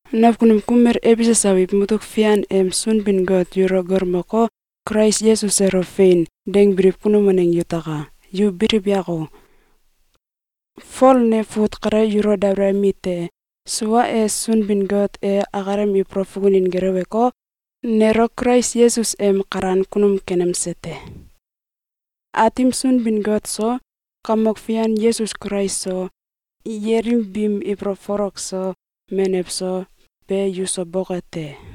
Nakunum kumel Efesus abiw mutuk fian em Sunbin-Got yulo galmoko, Kulais Yesus elo “Fein!”, dangbiliw kunum waneng yutaka! Yu biliw yako! Fol ne fut kale yulo dabalayemi te. Sua e, Sunbin-Got e akalem ibolow fukunin geleweko, nelo Kulais Yesus em kalan kunum kenemse te. Aatim Sunbin-Got so, Kamok Fian Yesus Kulais so, yelim biim ibolow folok so, menew so, be yuso boke te!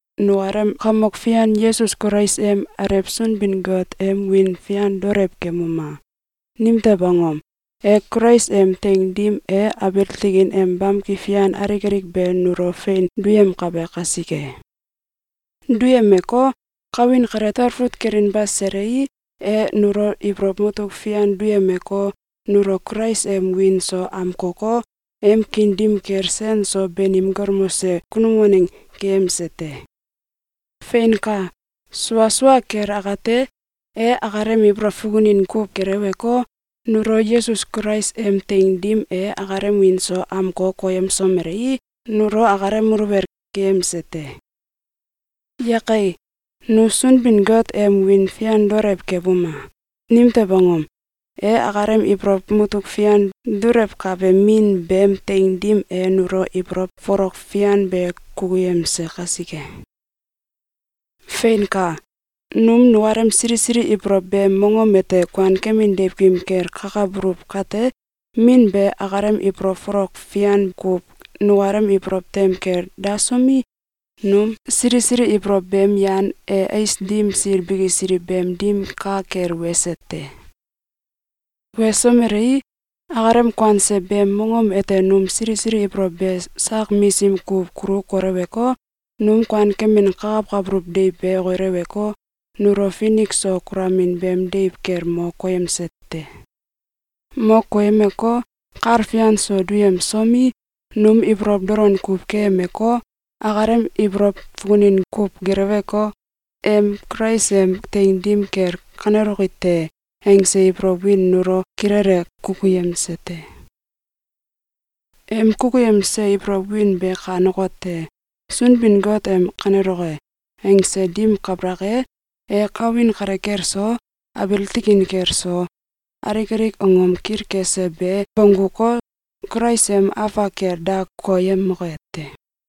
Nukalem Kamok Fian Yesus Kulais em Alew Sunbin-Got em wiin fian daolew kemuma! Nimtew angom? E Kulais em teing dim e abiil tikin em bamki fian alik alik be nulo fein duyemkabe kasike. Duyemeko, kawin kale talfut kelinba selei, e nulo ibolow mutuk fian duyemeko, nulo Kulais em wiin so amkoko, em kiin dim kel sen so banim galmose kunum waneng keyemse te. Feinka! Sua sua kel akate, e akalem ibolow fukunin kuw geleweko, nulo Yesus Kulais em teing dim e akalem wiin so amko koyemsomelei, nulo akalem muluwel keyemse te. Yake! Nu Sunbin-Got em wiin fian daolew kebuma! Nimtew angom? E akalem ibolow mutuk fian dulewkabe Min beem teing dim e nulo ibolow folok fian be kukuyemse kasike! Feinka! Nu nukalem sili sili ibolow beem mongom ete kuankemin deiwkim kel kakabuluw kate, Min be akalem ibolow folok fian kuw nukalem ibolow tem kel dasomi, num sili sili ibolow beem yan e ais dim sil bikisiliw beem dim ka kel wese te. Wesomelei, akalem kuanse beem mongom ete num sili sili ibolow be sak misim kuw kulu koleweko, num kuankemin kakawkabuluw deiw be okileweko, nulo finik so kulamin beem deiw kel mo koyemse te. Mo koyemeko, kal fian so duyemsomi, num ibolow dolon kuw keyemeko, akalem ibolow fukunin kuw geleweko, em “Kulais em teing dim kel kaneloki te!”, angse ibolow win nulo kilele kukuyemse te. Em kukuyemse ibolow win be kanekote: Sunbin-Got em “Kaneloke!”, angse ding kabalak e, e kawin kale kel so, abiil tikin kel so, alik alik angom kilkese be bongguko, Kulais em afak kel da koyemoke te.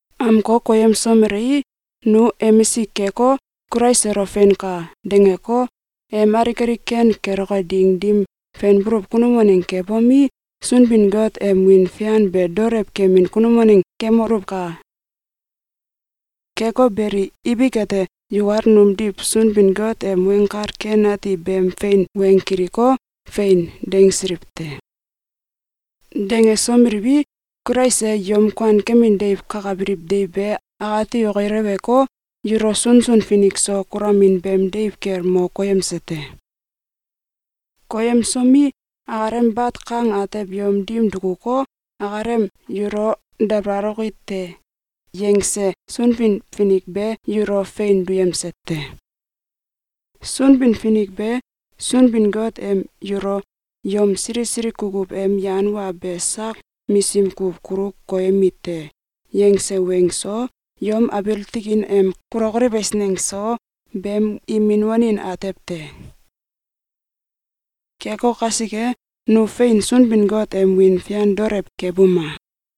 Amko koyemsomelei, nu emisik keko, Kulais elo “Feinka!”, dangeko, em alik alik ken keloke ding dim fenbuluw kunum waneng kebomi, Sunbin-Got em wiin fian be daolew kemin kunum waneng kemoluwka! Keko beli, ibik ete, yukal numdiw Sunbin-Got em Weng Kal Ken Ati beem fein weng kiliko, “Fein!”, dangsiliw te. Dangesomeliwi, Kulais e yom kuankemin deiw kakabiliw deiw be akati okileweko, yulo sunsun finik so kulamin beem deiw kel mo koyemse te. Koyemsomi, akalem bat kang atew yom dim dukuko, akalem “Yulo dabalaloki te!”, yangse Sunbin-Finik be yulo fein duyemse te. Sunbin-Finik be Sunbin-Got em yulo “Yom sili sili kukuw em yan wa be sak misim kuw kulu koyemi te!”, yangse weng so, yom abiil tikin em kulokoliw eisneng so, beem imin wanin atew te. Keko kasike, nu fein Sunbin-Got em wiin fian daolew kebuma!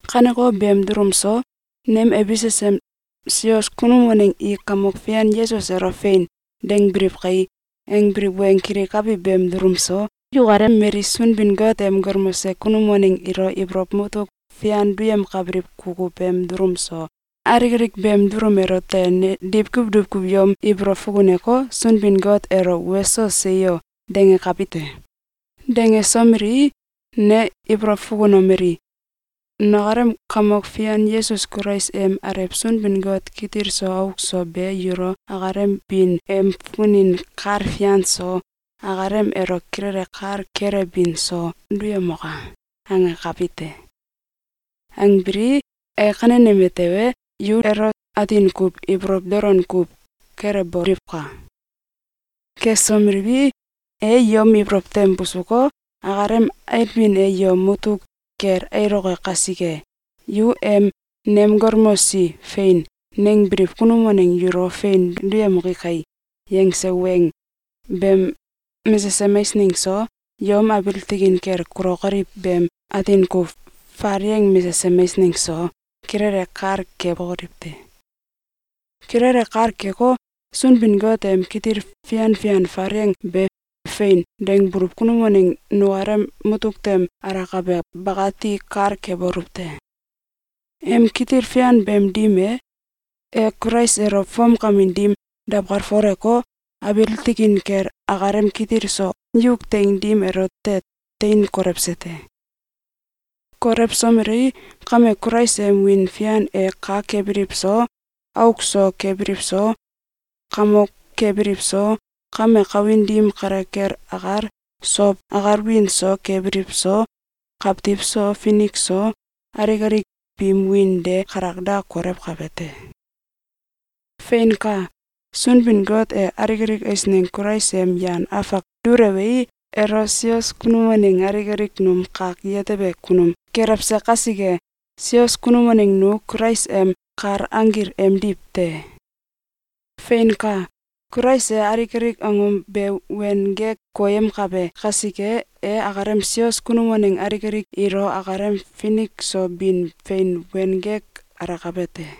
Kaneko beem dulum so, nem “Efesus em sios kunum waneng i Kamok Fian Yesus elo ‘Fein!’, dangbiliw kai!”, angbiliw weng kilikabi beem dulum so, yukalem mali Sunbin-Got em galmose kunum waneng ilo ibolow mutuk fian duyemkabiliw kukuw beem dulum so, alik alik beem dulum elote ne diwkuw diwkuw yom ibolow fukuneko, Sunbin-Got elo “Weso! Seyo!”, dangakabi te. Dangesomelii, ne ibolow fukunomeli: “Nukalem Kamok Fian Yesus Kulais em Alew Sunbin-Got kitil so auk so be yulo akalem bin em fukunin kal fian so, akalem elo kilele kal kelewbin so, duyemoka!”, angakabi te. Angbilii, e kaneyeme tewe, yu elo atin kuw ibolow dolon kuw kelewboliwka! Kesomeliwi, e yom ibolow tem busuko, akalem ailbin e yom mutuk kel ailoke kasike, yu em “Nem galmosi ‘Fein!’, nangbiliw kunum waneng yulo fein duyemoki kai!”, yangse weng beem mesesem eisneng so, yom abiil tikin kel kulokoliw beem atin kuw falieng mesesem eisneng so, kilele kal kebokoliw te. Kilele kal keko, Sunbin-Got em kitil fian fian falieng be “Fein!”, dangbuluw kunum waneng nukalem mutuk tem alakabe bakati kal kebuluw te. Em kitil fian beem dim e, e Kulais elo fomkamin dim dawkalfoleko, abiil tikin kel akalem kitil so yuk teing dim elote tein kolewse te. Kolewsomelei, kame Kulais em wiin fian e kak kebiliw so, auk so kebiliw so, kamok kebiliw so, kame kawin dim kale kel akal, sow akal wiin so kebiliw so, kawtiw so finik so, alik alik biim wiin de kalak da kolewkabe te. Feinka! Sunbin-Got e alik alik eisneng Kulais em yan afak dulewei, elo sios kunum waneng alik alik num kak yetebe kunum kelewse kasike, sios kunum waneng nu Kulais em kal anggil emdiw te. Feinka! Kulais e alik alik angom be wen gek koyemkabe kasike, e akalem sios kunum waneng alik alik ilo akalem finik so bin fein wen gek alakabe te.